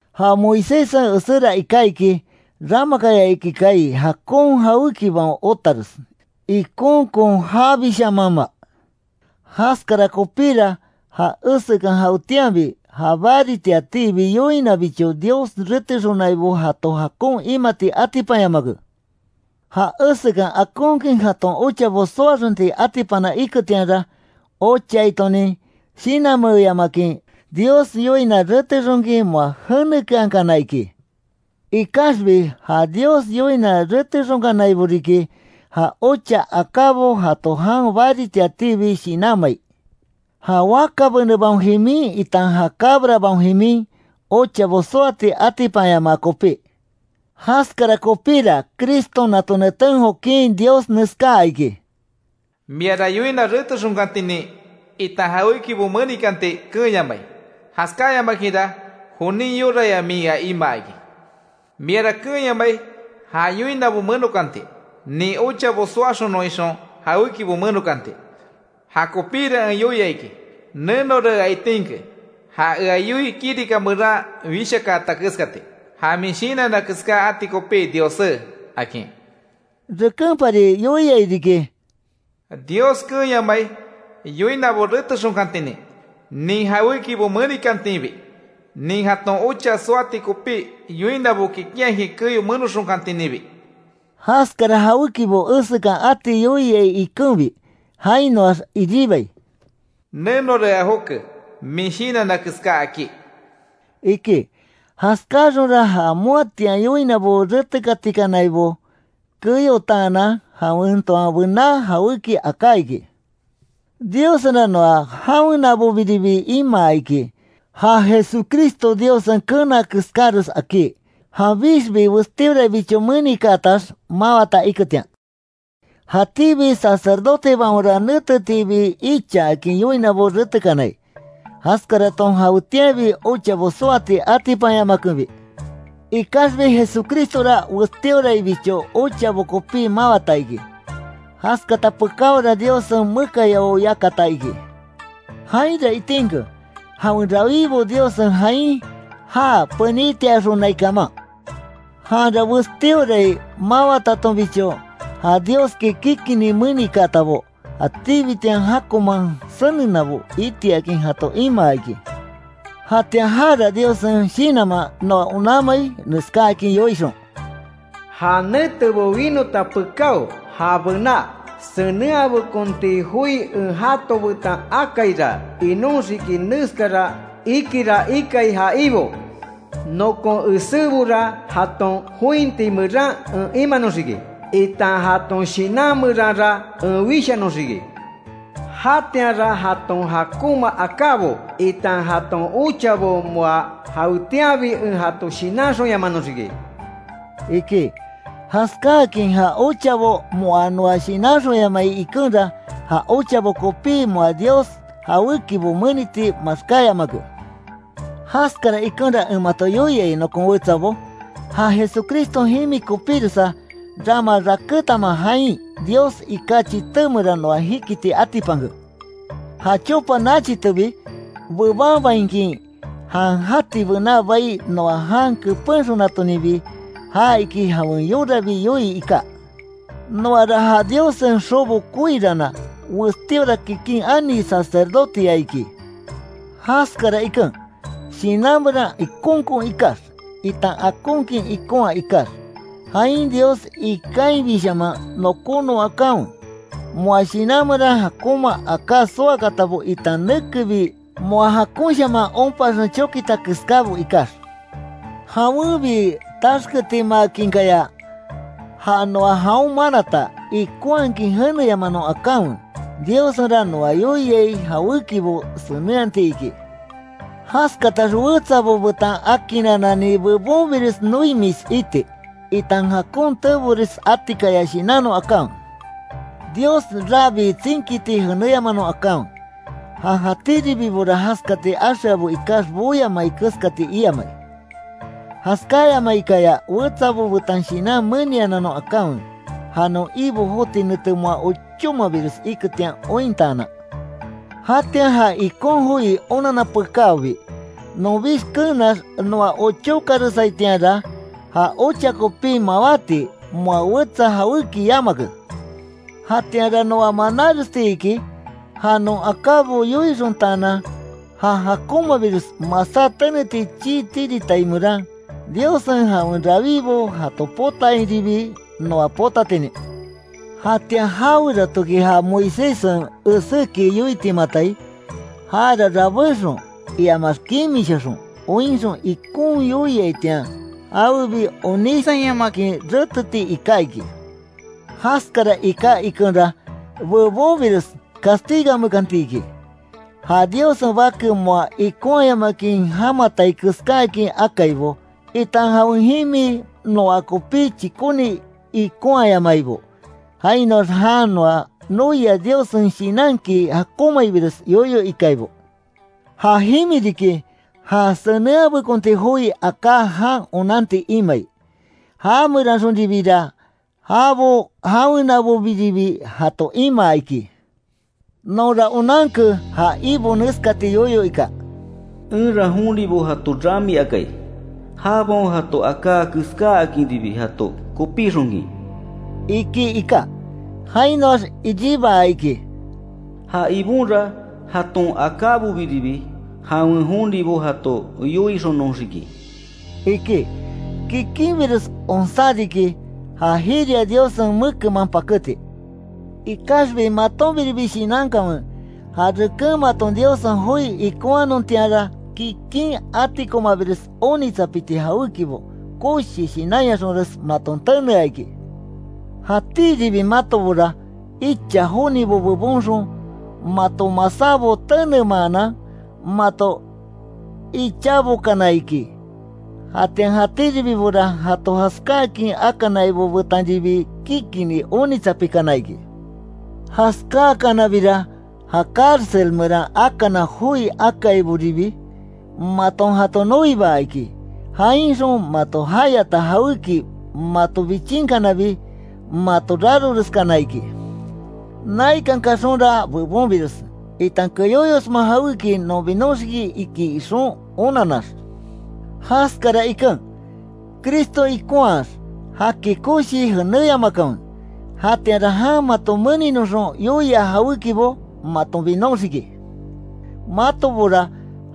Ja Moiséssen eséra iká iki, ramakaya iki kaai jakon jawékibaon otares, ikonkon jabishamanma. Jaskara kopíra ja esekan jawetianbi ja baritiatiibi yoinabicho Dios retexonaibo jato jakon imati atipanyamake. Ja esekan akonkin jaton ochabo soaxonti atipana iketianra; ochaitonin shinanmeeyamakin, Dios yoina retexonkin moa jenekeankana iki. Ikaxbi ja Dios yoina retexonkanaibo riki, ja ocha akábo jato jan baritiatiibi shinanmai, ja waka benebaon jimin itan ja cabrabaon jimin, ochabo soati atipanyamaa kopí. Jaskara kopíra Criston nato neten jokin Dios neskaa iki: “Miara yoina retexonkantinin, itan jawékibo menikanti keenyamai, jaskáyamakinra jonin yoraya min ea imaa iki. Miara keenyamai ja yoinabo menokanti, nin ochabo soaxonon ixon jawékibo menokanti. Jakopíra en yoia iki: ‘Nenora ea itinke ja ea yoii kirika meran wishakaata keskati, ja min shinanna keská ati kopí Diossé’”, akin. Rekenpari yoiai riki: Dios keenyamai yoinabo retexonkantinin, nin jawékibo menikantinbi, nin jaton ocha soati kopí yoinabo kikinhakin keyo menoxonkantininbi. Jaskara jawékibo esekan ati yoiai ikenbi. Jainoax iribai: “Nenora ea joke min shinanna keská akí”, iki. Jaskáaxonra ja moatian yoinabo retekatikanaibo keyotaanan, jawen toan bená jawéki aká iki. Diossenra noa jawenabobiribi imaa iki, ja Jesucristo Diossen keena keskáres akí, janbixbi westíoraibicho menikaatax, mawata iketian. Jatíbi sacerdotebaonra netetiibi ichaakin yoinabo retekanai, jaskaraton jawetianbi ochabo soati atipanyamakenbi. Ikaxbi Jesucristora, westíoraibicho ochabo kopí mawata iki. Jaskata pekáora Diossen mekayao yakata iki. Jainra itinke, jawen rawíbo Diossen jain já penítiaxonai kaman. Janra westíorai mawatatonbicho, ja Dioski kikinni menikaatabo, jatíbitian jakonman senenabo itiakin jato imaa iki. Jatian jara Diossen Shinanman noa onanmai neskáakin yoixon: “Ja netebo winota pekáo, ja bená senenhabekonti joi en jato betan akaira, inoxiki neskara ikira ikai ja Ibo: Nokon esébora jaton jointi meran en imanoxiki, itan jaton shinan meranra en wishanoxiki. Jatianra jaton jakonma akábo, itan jaton ochabo moa jawetianbi en jato shinanxonyamanoxiki”, iki. Jaskáakin ja ochabo moa noa shinanxonyamai ikenra, ja ochabo kopí moa Dios jawékibo meniti maxkáyamake. Jaskara ikenra en mato yoiai nokon wetsabo, ja Jesucriston jimi kopíresa, rama rakétanma jain Dios iká chité meran noa jikiti atipanke, ja chopa nachitebi bebanbainkin, jan jati bená bai noa jan kepenxonatoninbi. Ja iki jawen yorabi yoii iká. Noara ja Diossen xobo koiranna, westíora kikin ani sacerdoteya iki. Jaskara iken, shinan meran ikonkon ikax, itan akonkin ikonhaa ikax, jain Dios ikainbishaman nokónon akanwe. Moa shinan meran jakonma aká soakaatabo itan nekebi moa jakonshaman onpaxen chokita keskábo ikax. Jawenbi taxketimaakinkaya, ja noa jaon manata, ikonhakin jeneyamanon akanwe. Diossenra noa yoia jawékibo senenhati iki. Jaskatax wetsabo betan akinananni bebonbires noimis iti, itan jakon teebores atikaya shinanon akanwe. Dios rabí tsinkiti jeneyamanon akanwe, ja jatíribibo jaskati axeabo ikax boyamai keskati iamai. Jaskáyamaikaya wetsabo betan shinan menianannon akanwe; ja non Ibo joti nete moa ochómabires iketian ointaanan. Jatian ja ikon joi onanna pekáobi, nonbix keenax noa ochakaresaitianra, ja ocha kopi mawáti, moa wetsa jawéki yamake. Jatianra noa manáresti iki, ja non akábo yoixontaanan ja jakonmabires masá teneti chii tiritai meran, Diossen jawen rawibo jato potatiainribi noa potatinin. Jatian jaweratoki ja Moiséssen eséki yoitimatai, jara rabéxon, iamax kimishaxon, oinxon ikon yoiaitian jawebi onísayamakin reteti iká iki. Jaskara iká ikenra, bebonbires castigamekanti iki, ja Diossen Bake moa ikonhayamakin jamatai keskáakin akaibo, itan jawen jimi noa kopí chíkoni ikonhayamaibo, jainoax jan noa noia Diossen Shinanki jakonmaibires yoyo ikaibo. Ja jimi riki ja senenhabekonti joi aká jan onanti imai, ja meranxonribira, jabo jawenabobiribi jato imaa iki. Nonra onanke ja Ibo neskati yoyo ika: “Enra jonibo jato ramiakai, jabaon jato aká keskáakinribi jato kopíxonkin”, iki iká. Jainoax iribaa iki: “Ja Ibonra, jaton akábobiribi jawen jonibo jato yoixonoxiki”, iki. ¡Kikinbires onsá riki, ja jiria Diossen mekenman paketi! Ikaxbi matonbiribi shinankanwe, ja reken maton Diossen joi ikonhanontianra kikin, atikomabires onitsapiti jawékibo, koshi shinanyaxonres maton tenea iki. Jatíribi matobora, icha jonibo bebonxon, mato masábo tenemaanan, mato ichaabokana iki. Jatian jatíribibora jato jaskáakin akanaibo betanribi kikinni onitsapikana iki. Jaskáakanabira, ja cárcel meran akana joi akaiboribi maton jato noibaa iki. Jainxon mato jayata jawéki mato bichinkanabi, mato raroreskana iki. Naikan kaxonra bebonbires, itan keyóyosma jawéki non binoxiki iki ixon onannax. Jaskara iken, Cristo ikonhaax jaki koshii jeneyamakanwe. Jatianra jan mato meninoxon yoia jawékibo, maton binoxiki. Matobora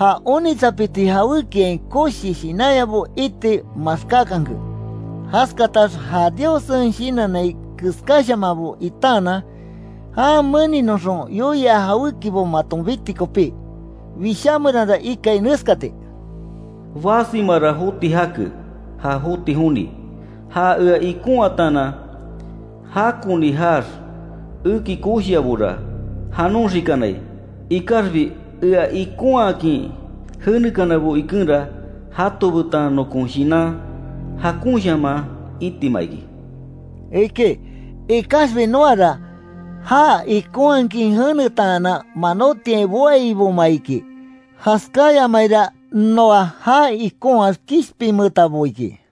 ja onitsapiti jawékiain koshi shinanyabo iti maxkákanke. Jaskatax ja Diossen shinannai keskáshamanbo itaanan, jan meninoxon yoia jawékibo maton biti kopí. Wishá meranra ikai neskati: “Basimara joti jake, ja joti joni. Ja ea ikonhataanan, jakoni jaax eki koshiabora, janoxikanai, ikaxbi ea ikonhakin jenekanabo ikenra jato betan nokon shinan jakonshaman itima iki”, iki. Ikaxbi noara, já ikonhakin jenetaanan, manotiain boaiboma iki. Jaskáyamaira noa já ikonhaax kishpinmeetabo iki.